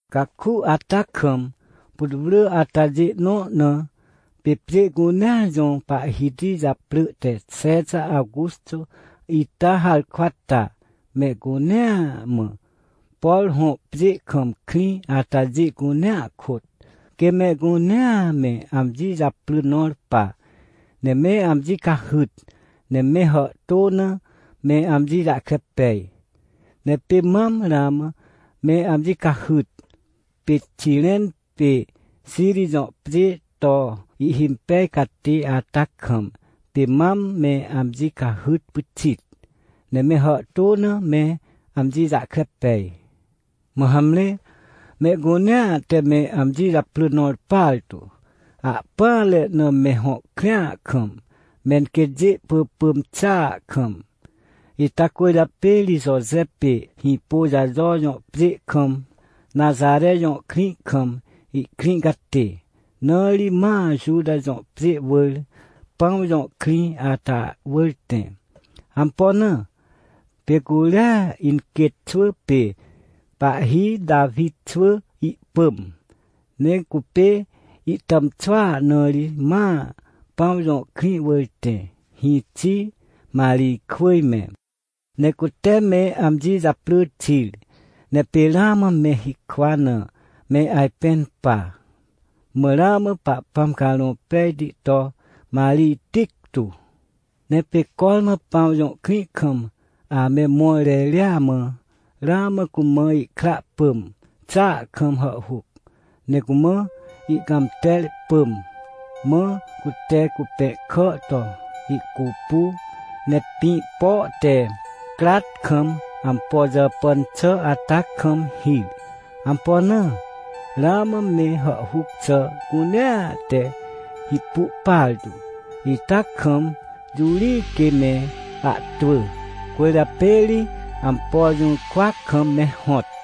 Caku ata kam, putwrỳ atajê nõ na, pê pjê cunea jõ pahhiti japrỳ te Xexa Aguxô ita harkwa ta, mehcunea mã, por hõ pjê kam krĩ atajê cunea kôt, quê mehcunea me amji japrỳ nõr pa, ne me amji cahyt, ne me hàhtô na me amji jahkre pej. Ne pê mam ramã me amji cahyt, pê Xiren pê Xiri jõ pjê to ihhimpej catê ata kam, pê mam me amji cahyt pyxit, ne me hàhtô na me amji jahkre pej. Mã hamre, mehcunea te me amji japrỳ nõr partu, ahpỹanre na me hõ krĩa kam, menquêtjê ihpỳpỳm xàa kam. Ita cwỳrjapê ri Joje pê Hĩpôjajo jõ pjê kam, Naxare jõ krĩ kam, ihkrĩ catê, na ri ma Juta jõ pjê wỳr, Pãw jõ krĩ ata wỳr tẽ. Ampo na? Pê curia inquêt xwỳ pê pahhi Tawi xwỳ ihpỳm, ne cupê ihtàmxwỳa, na ri ma Pãw jõ krĩ wỳr tẽ, hĩxi Marijkwỳj me. Ne cute me amji japrỳ xir. Ne pê ramã me hikwa na me ajpẽn pa. Mã ramã Pahpãm Carõ Pejti to Marij tictu. Ne pê cormã Pãw jõ krĩ kam ame mõr reria mã, ramã cumã ihkra pỳm xàa kam hàhhuc. Ne cumã ihcãmter pỳm, mã cute cupẽhkà to ihcupu, ne pĩ po te crat kam ampo jàpàn xà ata kam hir. Ampo na? Ramã me hàhhuc xà cunea te hipu partu, ita kam, jũ ri quê me ahtwỳ? Cwỳrjapê ri ampo jũrkwa kam me hõt.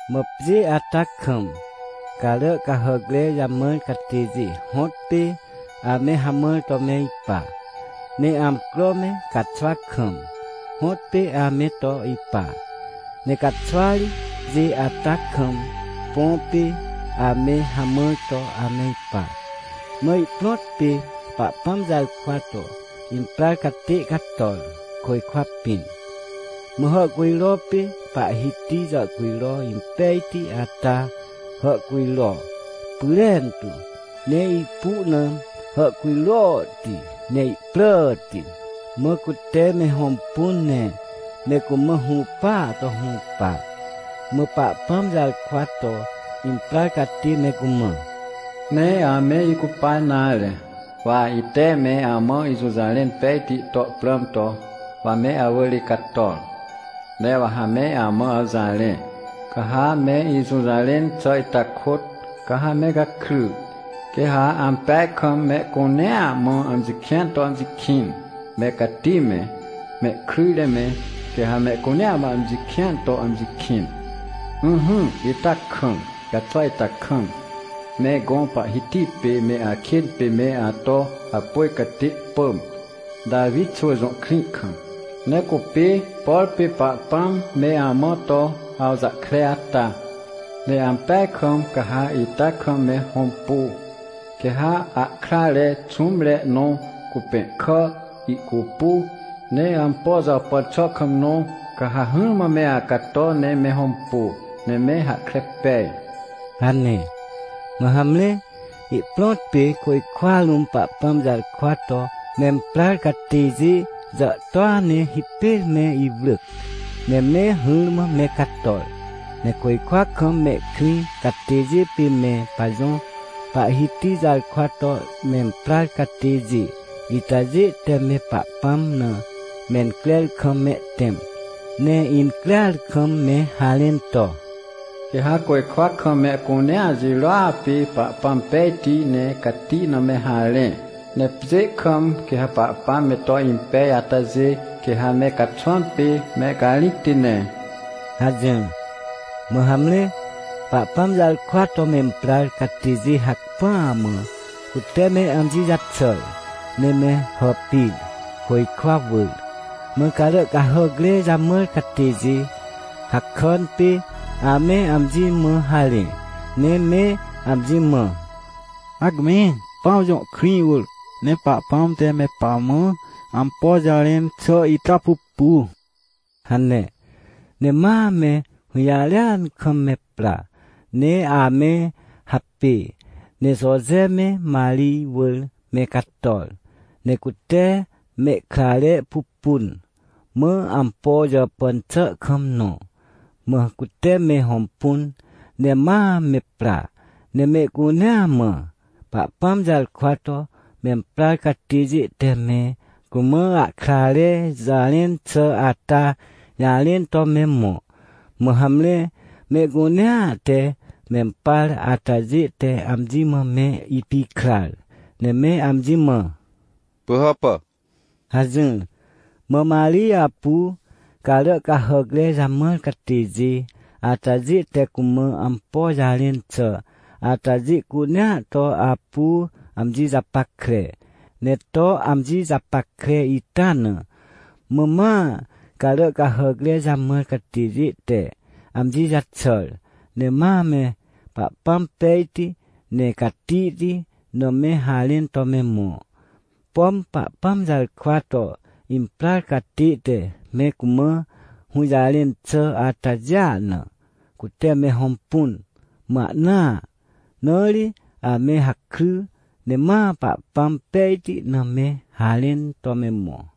Mã pjê ata kam, carà cahàcre jamãr catêjê hõtpê ame hamãr to me ipa. Ne amcro me caxwa kam, hõtpê ame to ipa. Ne caxwa ri, pjê ata kam, põ pê ame hamãr to ame ipa. Mã ihprõt pê Pahpãm jarkwa to imprar catê cator, côjkwa pĩn. Mã hàhcujro pê Pahhiti jàhcujro impejti ata hàhcujro pyrentu, ne ipu na hàhcujrohti, ne ihpràti. Mã cute me hõmpun ne me cumã hũpaa to hũpa. Mã Pahpãm jarkwa to imprar catê me cumã: ― Nee ame icupa nare. Wa ite me amã ijũjarẽn pejti to prãm to, wa me awỳr icator. Ne wa ha me amã awjarẽ, ca ha me ijũjarẽn xà ita kôt, ca ha me gakry, quê ha ampeaj kam mehcunea mã amji kĩan to amji kĩn, me cati me, mehkryjre me, quê ha mehcunea mã amji kĩan to amji kĩn. Ỹhỹ, ita kam, caxwa ita kam, me gõ Pahhiti pê me akên pê me ato hapôj catê pỳm, Tawi xwỳ jõ krĩ kam. Ne cupê, por pê Pahpãm me amã to awjahkre ata. Ne ampeaj kam ca ha ita kam me hõmpu. Quê ha ahkrare xũmre nõ cupẽhkà ihcupu, ne ampo jàpàn xà kam nõ, ca ha hỹrmã me acato ne me hõmpu, ne me hahkre pej ― hane. Mã hamre, ihprõt pê côjkwa rũm Pahpãm jarkwa to memprar catêjê jàhtôa ne hipêr me iwrỳc, ne me hỹrmã me cator. Ne côjkwa kam mehkrĩ catêjê pê me pajõ Pahhiti jarkwa to memprar catêjê itajê te me Pahpãm na mencrer kam mehtẽm, ne increar kam me harẽn to: “Quê ha côjkwa kam mehcunea jirôa pê Pahpãm pejti ne cati na me harẽ. Ne pjê kam, quê ha Pahpãm me to impej atajê, quê ha me caxwãm pê mehcarĩcti ne” hajỹr. Mã hamre, Pahpãm jarkwa to memprar catêjê hacpỹa mã cute me amji jaxàr, ne me hàpir, côjkwa wỳr. Mã carà cahàcre jamãr catêjê, hakàn pê ame amji mã harẽ, ne me amji mã: ― Hacme, Pãw jõ krĩ wỳr, ne Pahpãm te me pamã ampo jarẽn xà ita pupu ― hane. Ne ma me hũjarêan kam me pra, ne ame hapê, ne Joje me Marij wỳr me cator, ne cute mehkrare pupun, mã ampo jàpàn xà kam nõ. Mã cute me hõmpun, ne ma me pra ne mehcunea mã, Pahpãm jarkwa to memprar catêjê te me cumã ahkrare jarẽn xà ata jarẽn to me mõ. Mã hamre, mehcunea te mempar atajê te amji mã me ipikrar, ne me amji mã: ― Pỳhàpà? ― hajỹr. Mã Marij apu carà cahàcre jamãr catêjê atajê te cumã ampo jarẽn xà atajê cunea to apu amji japackre, ne to amji japackre ita na. Mã ma carà cahàcre jamãr catêjê te amji jaxàr, ne ma me Pahpãm pejti, ne catihti na me harẽn to me mõ. Pom Pahpãm jarkwa to imprar catê te me cumã hũjarẽn xà atajêa na, cute me hõmpun, mã ahnaa. Na ri ame hakry ne ma Pahpãm pejti na me harẽn to me mõ.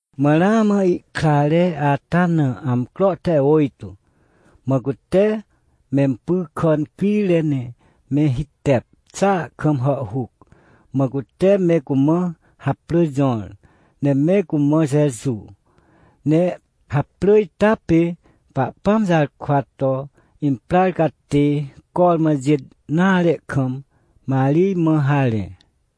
Mã ramã ihkrare ata na amcro te ôjtô, mã cute mempy kà incrire ne me hitep xàa kam hàhhuc, mã cute me cumã haprỳ jõr, ne me cumã Jeju. Ne haprỳ ita pê Pahpãm jarkwa to imprar catê cormã jêt nare kam, Marij mã harẽ.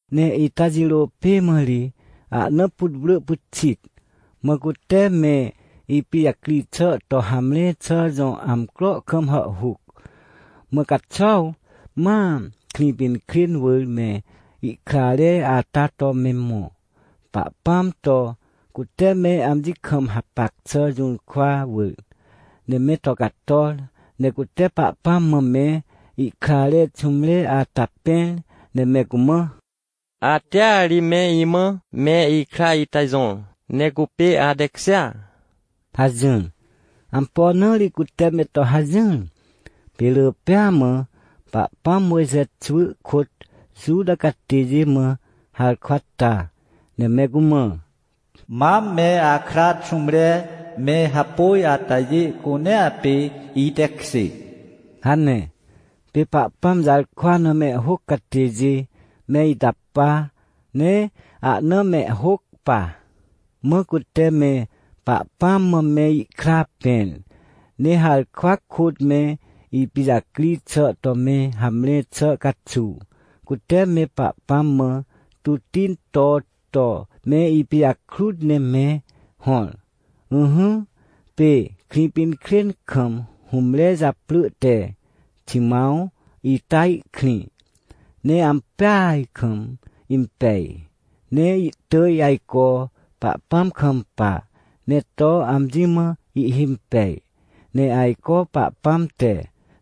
Ne ita jirô pê mã ri ahna putwrỳ pyxit, mã cute me ipijacri xà to hamre xà jõ amcro kam hàhhuc. Mã caxuaw ma Krĩpinkrên wỳr me ihkrare ata to me mõ, Pahpãm to cute me amji kam hapac xà jũrkwa wỳr. Ne me to cator, ne cute Pahpãm mã me ihkrare xũmre ata pẽr ne me cumã: ― Atea ri me imã me ikra ita jõr, ne cupê atekjêa ― hajỹr. Ampo na ri cute me to hajỹr? Pê rỳ pêa mã Pahpãm Mojxe xwỳ kôt Juta catêjê mã harkwa ta, ne me cumã: “Mam me akra xũmre me hapôj atajê cunea pê itekjê” hane. Pê Pahpãm jarkwa na mehhôc catêjê me ita pa, ne ahna mehhôc pa. Mã cute me Pahpãm mã me ihkra pẽr, ne harkwa kôt me ipijacri xà to me hamre xà caxuw, cute me Pahpãm mã tutti into to me ipijakrut ne me hõr. Ỹhỹ, pê Krĩpinkrên kam hũmre japrỳ te Ximãw ita ihkrĩ. Ne ampeaj kam impej, ne ihtỳj ajco Pahpãm kampa, ne to amji mã ihhimpej. Ne ajco Pahpãm te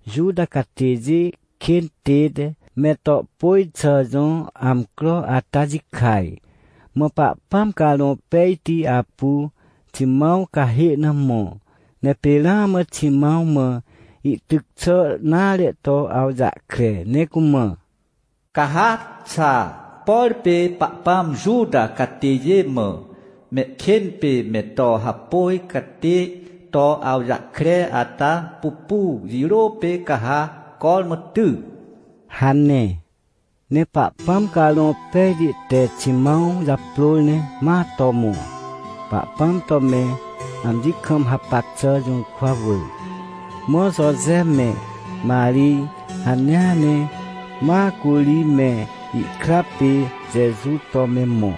Juta catêjê kên tête me to pôj xà jõ amcro ata jikaj. Mã Pahpãm Carõ Pejti apu Ximãw cahê na mõ, ne pê ramã Ximãw mã ihtyc xà nare to awjahkre ne cumã: ― Ca ha xaa, por pê Pahpãm Juta catêjê mã mehkên pê me to hapôj catê to awjahkre ata pupu, jirô pê ca ha cormã ty ― hane. Ne Pahpãm Carõ Pejti te Ximãw japrôr ne ma to mõ, Pahpãm to me amji kam hapac xà jũrkwa wỳr. Mã Joje me Marij hanea ne ma curi me ihkra pê Jeju to me mõ,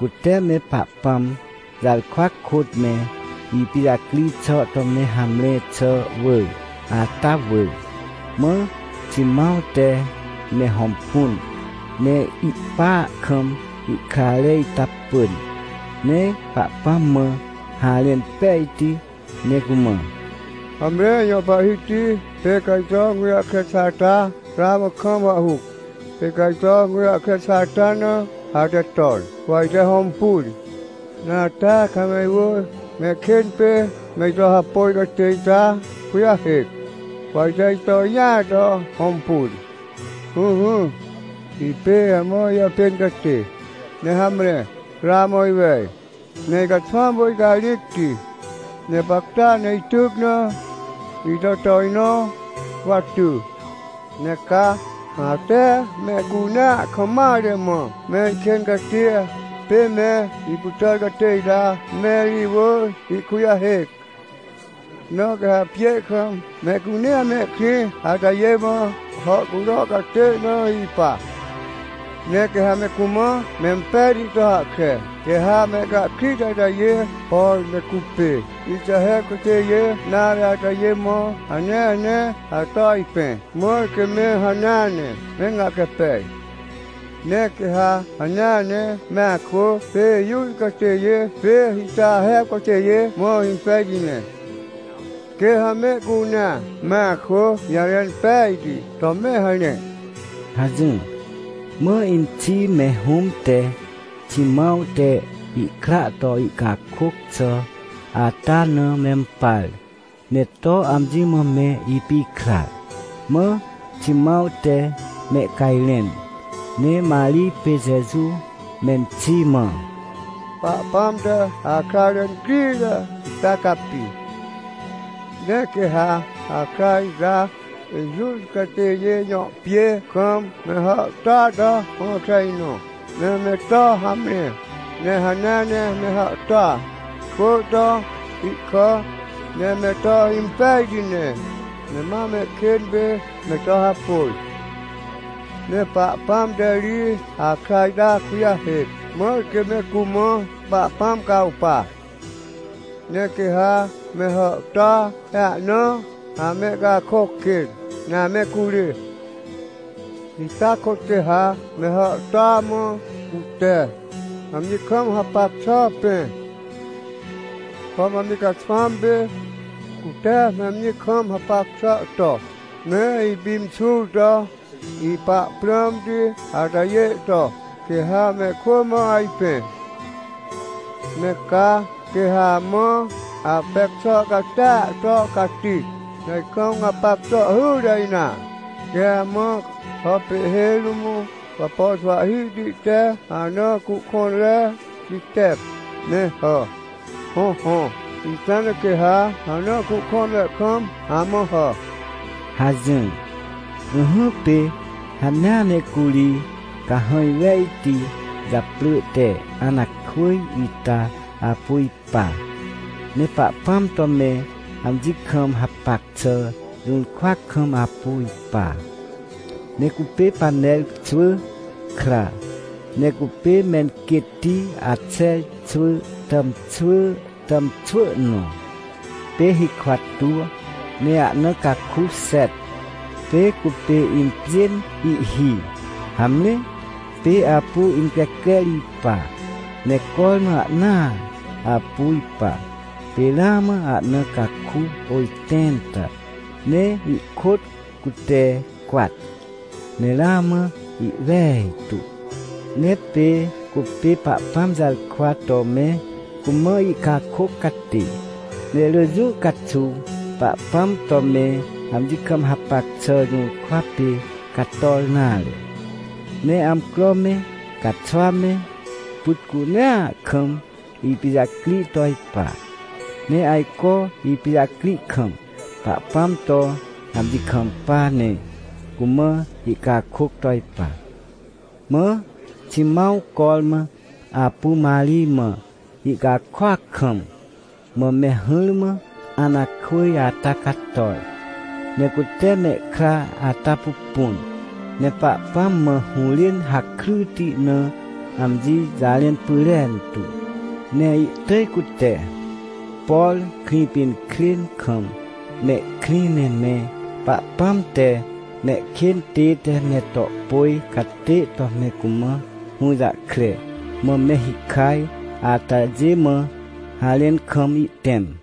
cute me Pahpãm jarkwa kôt me ipijacri xà to me hamre xà wỳr, ata wỳr. Mã Ximãw te me hõmpun, ne ihpa kam ihkrare ita pỳn, ne Pahpãm mã harẽn pejti, ne cumã: “Hamre, ijõ Pahhiti, pê ca ito gũjahkre xà ata ramã kaam hàhhuc. Ne pê ca ito gũjahkre xà ata na ate ton, wa ite hõmpun. Ne atea ca me iwỳr me ikên pê me ito hapôj catê ita kujahêc, wa ite ito jĩa to hõmpun. Ỹhỹ, ipê amã ijàpên catê, ne hamre, ramã iwej, ne icaxwãm pê icarĩcti, ne gapacta ne ityc na ito tojnõ, wa ty. Ne ca ate mehcunea kam mare mã me ikên catia pê me ipytàr catê ita me iwỳr ihkujahêc. Na quê ha pjê kam mehcunea mehkrĩ atajê mã hàhcujro catê na ipa. Ne quê ha me cumã mempejti to hahkre, quê ha mehcahkrit atajê, por me cupê Ixaher catêjê nare atajê mã hanea ne ato ajpẽ, mãr quê me hanea ne me gahkre pej. Ne quê ha hanea ne me akwỳ pê Juta catêjê pê Ixaher catêjê mã impejti ne. Quê ha mehcunea me akwỳ jarẽn pejti to me harẽ” hajỹr. Mã inxi me hũm te Ximãw te ihkra to ihcakôc xà ata na mempar, ne to amji mã me ipikrar. Mã Ximãw te mehcajrẽn, ne Marij pê Jeju menxi mã: ― Pahpãm te akrare incrire ita capi. Ne quê ha akra ita Juta catêjê jõ pjê kam me hàhtôa to hõkre nõ, ne me to hamre, ne hanea ne me hàhtôa kwỳ to ihkà, ne me to impejti ne, ne ma mehkên pê me to hapôj. Ne Pahpãm te ri akra ita kujahêc, mãr quê me cumã Pahpãm cawpa. Ne quê ha me hàhtôa ne ahna amehcakôc kên, ne ame curê. Ita kôt quê ha me hàhtôa mã cute amji kam hapac xà pẽ. Pom amji caxwãm pê cute me amji kam hapac xà to me ipimxur to ipa prãmti atajê to, quê ha mehkwỳ mã ajpẽ. Ne ca, quê ha amã apec xà catia to cati, ne ajkam gapac xà hyre nare. Quê ha amã hà pê ihhêj rũm wapo xwahhihti te ana cuhkõnre jitep, ne hà. Hõhõ, ita na quê ha ana cuhkõnre kam amã hà ― hajỹr. Ỹhỹ, pê hanea ne curi cahãj wejti japrỳ te Anakwỳj ita apu ipa. Ne Pahpãm to me amji kam hapac xà jũrkwa kam apu ipa. Ne cupê Paner xwỳ kra, ne cupê menquêtti Axer xwỳ tàmxwỳ tàmxwỳ nõ. Pê hikwa tuw ne ahna caku xet, pê cupê impjên ihhi. Hamre, pê apu increcrer ipa, ne cormã ahnaa apu ipa, pê ramã ahna caku ôjtẽnta ne ihkôt cute cwat, ne ramã ihwejtu. Ne pê cupê Pahpãm jarkwa to me cumã ihcakôc catê, ne rỳ jũ caxuw Pahpãm to me amji kam hapac xà jũrkwa pê cator nare. Ne amcro me, caxwa me, pyt cunea kam ipijacri to ipa. Ne ajco ipijacri kam, Pahpãm to amji kampa ne cumã ihcakôc to ipa. Mã Ximãw cormã apu Marij mã ihcakôac kam, mã me hỹrmã Anakwỳj ata cator, ne cute mehkra ata pupun, ne Pahpãm mã hũrên hakryti na amji jarẽn pyrentu. Ne ihtỳj cute, por Krĩpinkrên kam mehkrĩ ne me Pahpãm te mehkên tête me to pôj catê to me cumã hũjahkre, mã me hikaj atajê mã, harẽn kam ihtẽm.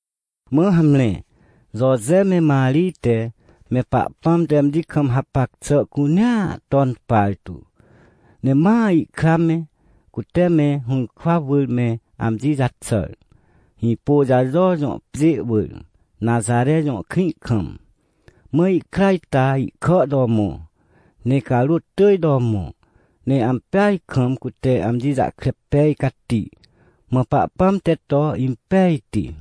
Mã hamre, Joje me Marij te me Pahpãm te amji kam hapac xà cunea ton partu, ne ma ihkra me, cute me hũrkwa wỳr me amji jaxàr, Hĩpôjajo jõ pjê wỳr, Naxare jõ krĩ kam. Mã ihkra ita ihkà to mõ, ne carôt tỳj to mõ. Ne ampeaj kam cute amji jahkre pej cati. Mã Pahpãm te to impejti.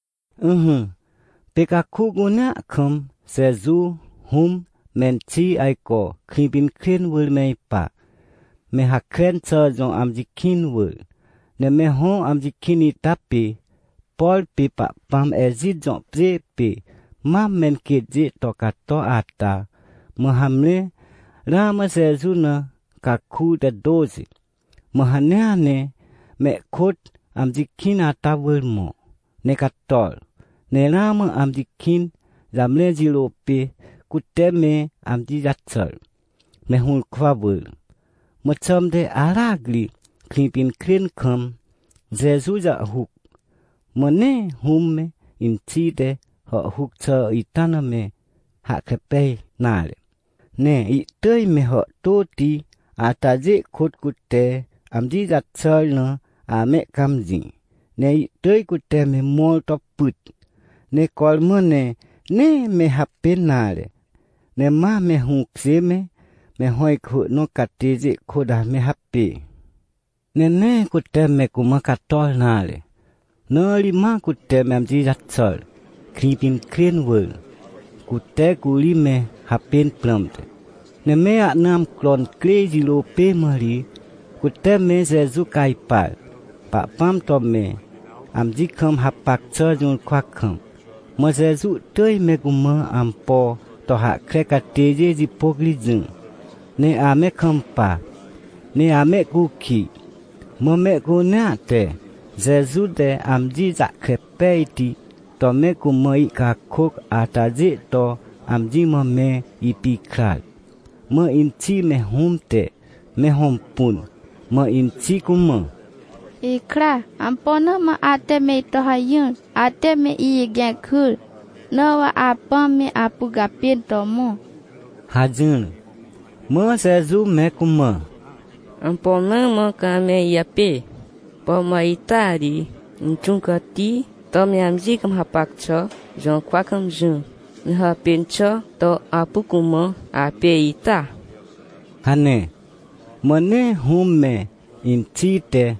Ỹhỹ, pê caku cunea kam Jeju hũm me inxi ajco Krĩpinkrên wỳr me ipa, me Hakren xà jõ amji kĩn wỳr. Ne me hõ amji kĩn ita pê, por pê Pahpãm Ejit jõ pjê pê mam menquêtjê to cato ata. Mã hamre, ramã Jeju na caku te tôxi, mã hanea ne mehkôt amji kĩn ata wỳr mõ, ne cator. Ne ramã amji kĩn jamre jirô pê, cute me amji jaxàr, me hũrkwa wỳr. Mã xãmte aracri Krĩpinkrên kam Jeju jàhhuc. Mã nee hũm me inxi te hàhhuc xà ita na me hahkre pej nare. Ne ihtỳj me hàhtôti atajê kôt cute amji jaxàr na amehcãmjĩ. Ne ihtỳj cute me mõr to pyt, ne cormã ne, nee me hapên nare, ne ma me hũkjê me, me hõ ihkwỳ nõ catêjê kôt ame hapê. Ne nee cute me cumã cator nare, na ri ma cute me amji jaxàr, Krĩpinkrên wỳr, cute curi me hapên prãmte. Ne me ahna amcro incrê jirô pê mã ri cute me Jeju cajpar, Pahpãm to me amji kam hapac xà jũrkwa kam. Mã Jeju ihtỳj me cumã ampo to hahkre catêjê jipôc ri jỹ, ne ame kampa, ne amehcukij. Mã mehcunea te Jeju te amji jahkre pejti to me cumã ihcakôc atajê to amji mã me ipikrar. Mã inxi me hũm te me hõmpun, mã inxi cumã: ― Ikra, ampo na mã ate me ito hajỹr? Ate me ijigẽc hyr, na wa apãm me apu gapên to mõ ― hajỹr. Mã Jeju me cumã: ― Ampo na mã ca ame ijapê? Pom wa ita ri Inxũ Cati to me amji kam hapac xà jũrkwa kam jỹ, ne hàpên xà to apu cumã apê ita? ― hane. Mã nee hũm me inxi te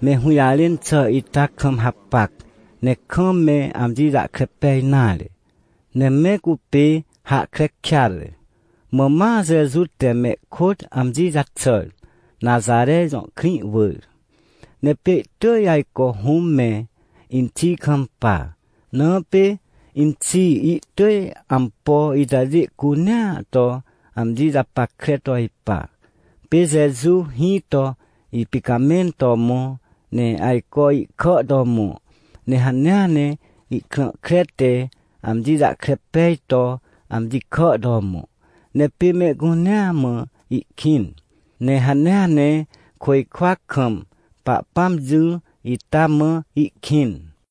me hũjarẽn xà ita kam hapac, ne kam me amji jahkre pej nare, ne me cupê hahkre kêatre. Mã ma Jeju te mehkôt amji jaxàr, Naxare jõ krĩ wỳr. Ne pê ihtỳj ajco hũm me inxi kampa. Na pê inxi ihtỳj ampo itajê cunea to amji japackre to ipa. Pê Jeju hĩ to ipicamẽn to mõ, ne ajco ihkà to mõ, ne hanea ne ihkrã kre te amji jahkre pej to amji kà to mõ. Ne pê mehcunea mã ihkĩn, ne hanea ne côjkwa kam Pahpãm jỹ ita mã ihkĩn.